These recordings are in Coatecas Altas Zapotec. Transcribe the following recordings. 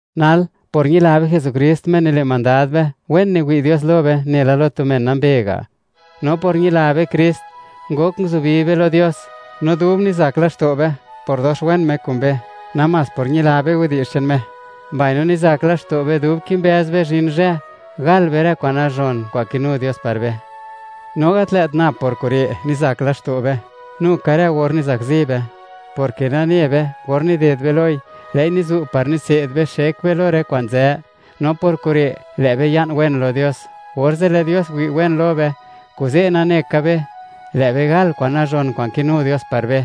Nal, por ñila be Jesukrist, Me nile' mandad be, wen niwi' Dios lo be nela lo tu men nambe ga'. No por ñila be Krist, ngok nguzubi be lo Dios, no dub nizak laxto' be por dox wen Me kun be namás por ñila be widi'zh che'n Me, mbaino nizak laxto' be dub kimbëz be zhin zhë, gal be rë kwa'n nazhon kwa'n kinu Dios par be. No gat lë't nab por kure' nizak laxto' be, nu ka rë or nizakzi be; porke nane be, or nided be loi, lë'i nizu' par nitse'd be xek be lo rë kwa'n nzë. No por kure', lë' be ya'n wen lo Dios, orze' lë' Dios wi' wen lo be, kuze' nane ka be, lë' be gal kwa'n nazhon kwa'n kinu Dios par be.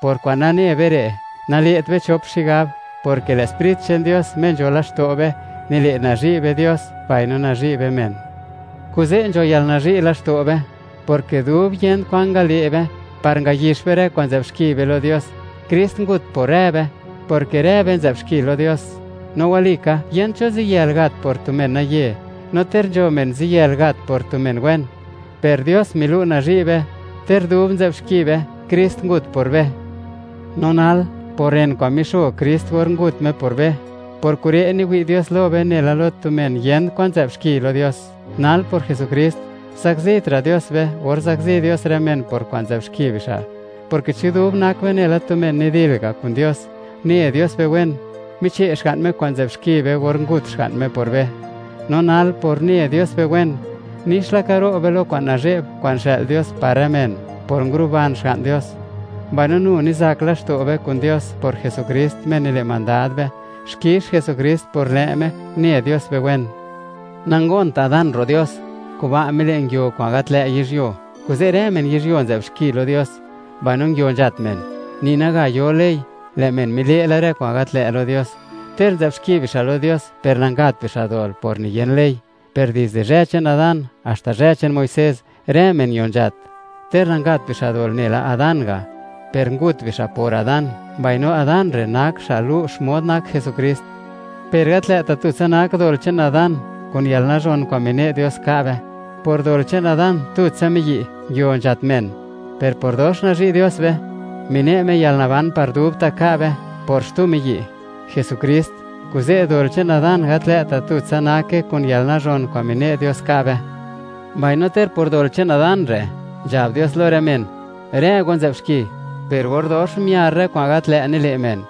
Por kwa'n nane be re', nale't be chop xigab, porke lë' Sprit che'n Dios, Me nzho laxto' be, nile' nazhi' be Dios mbaino nazhi' be men. Kuze', nzho yalnazhi' laxto' be, porke dub yent kwan ngale' be, par ngayix be rë kwa'n nzë'b xki be lo Dios, Krist ngut por rë be, porke rë be nzë'b xki lo Dios. No walika, yent cho ziyël gat por tu menaye, no ter nzho men ziyël gat por tu men wen. Per Dios milu' nazhi' be, ter dub nzë'b xki be, Krist ngut por be. No nal, por ren kwa'n mixo Krist or ngut Me por be, por kure' niwi' Dios lo be nela lo tu men yent kwan nzë'b xki lo Dios. Nal por Jesukrist, zakzitra' Dios be or zakzi Dios rë men por kwa'n nzë'b xki bixa', porke chi dub nak be nela tu men nidil ga' kun Dios, une Dios be wen, miche' Xga'n Me kwa'n nzë'b xki be or ngut Xga'n Me por be, no nal por une Dios be wen, nix laka ro' be lo kwa'n nazhe'b kwa'n xë'l Dios par rë men por nguruban Xga'n Dios. Mbaino nu nizak laxto' be kun Dios por Jesukrist, Me nile' mandad be. Xkix Jesukrist por lë' Me une Dios be wen. Nangont Adán ro' Dios; kuba' mile', nguio kwa'n gat lë' yizhyuo; kuze' rë men yizhyuo nzë'b xki lo Dios, mbaino nguio nzhat men. Ni naga yo ley, lë' men mile' la rë kwa'n gat lë' lo Dios; ter nzë'b xki bixa' lo Dios per nangapt bixa' dol por niyen ley. Per dizde zhë che'n Adán haxta zhë che'n Muisés, rë men ño nzhat, ter nangapt bixa' dol nela Adán ga', per ngut bixa' por Adán, mbaino Adán re' nak xa' lu' xmod nak Jesukrist. Per gat lë't tutsa nak dol che'n Adán kun yalnazhon kwa'n mine' Dios ka' be; por dol che'n Adán, tutsa miyi', nguio nzhat men, per por dox nazhi' Dios be, mine' Me yalnaban par dubta' ka' be por Jesukrist, xtu miyi'. Kuze', dol che'n Adán gat lë't tutsa nake kun yalnazhon kwa'n mine' Dios ka' be, mbaino, ter por dol che'n Adán re', nzhab Dios lo rë men: “Rë go nzë'b xki”, per or dox miar rë kwa'n gat lë' nile' men,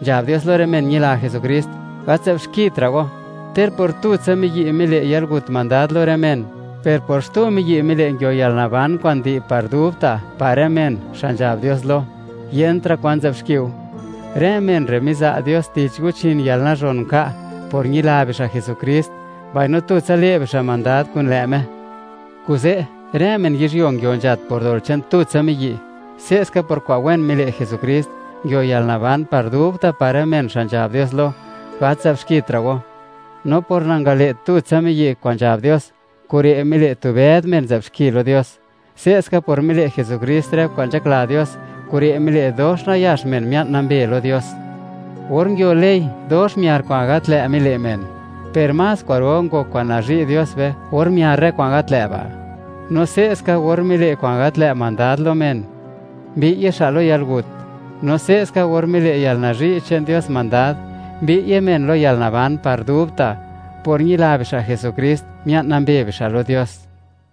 nzhab Dios lo rë men ñila Jesukrist: “Gat nzë'b xkitra' go.” Ter por tutsa miyi' mile' yalgut mandad lo rë men, per por xtu miyi' mile' nguio yalnaban kwa'n di' par dubta' par rë men xa' nzhab Dios lo: “Yentra' kwa'n nzë'b xkiu.” Rë men re' miza' Dios tich guchin yalnazhon nka' por ñila bixa' Jesukrist, mbaino le' bixa' mandad kun lë' Me. Kuze', rë men yizhyuo nguio nzhat por dol che'n tutsa miyi'; se'ska por kwa'n wen mile' Jesukrist, nguio yalnaban par dubta' par rë men xa' nzhab Dios lo: “Gat nzë'bxkitra' go.” No por nangale' tutsa miyi' kwa'n nzhab Dios, kure' mile' tu bëd men nzë'b xki lo Dios; se'ska por mile' Jesukrist rë kwa'n nzhakla Dios, kure' mile' dox nayax men mia'n nambe lo Dios. Or nguio ley, dox miar kwa'n gat lë' mile' men; per más kwa'ro ngok kwa'n nazhi' kun Dios be or miar rë kwa'n gat lë'. No se'ska or mile' kwa'n gat lë' mandad lo men, mbi'ye xa' lo yalgut; no se'ska, or mile' yalnazhi' che'n Dios mandad, mbi'ye men lo yalnaban par dubta'; por ñila bixa' Jesukrist, mia'n nambe bixa' lo Dios.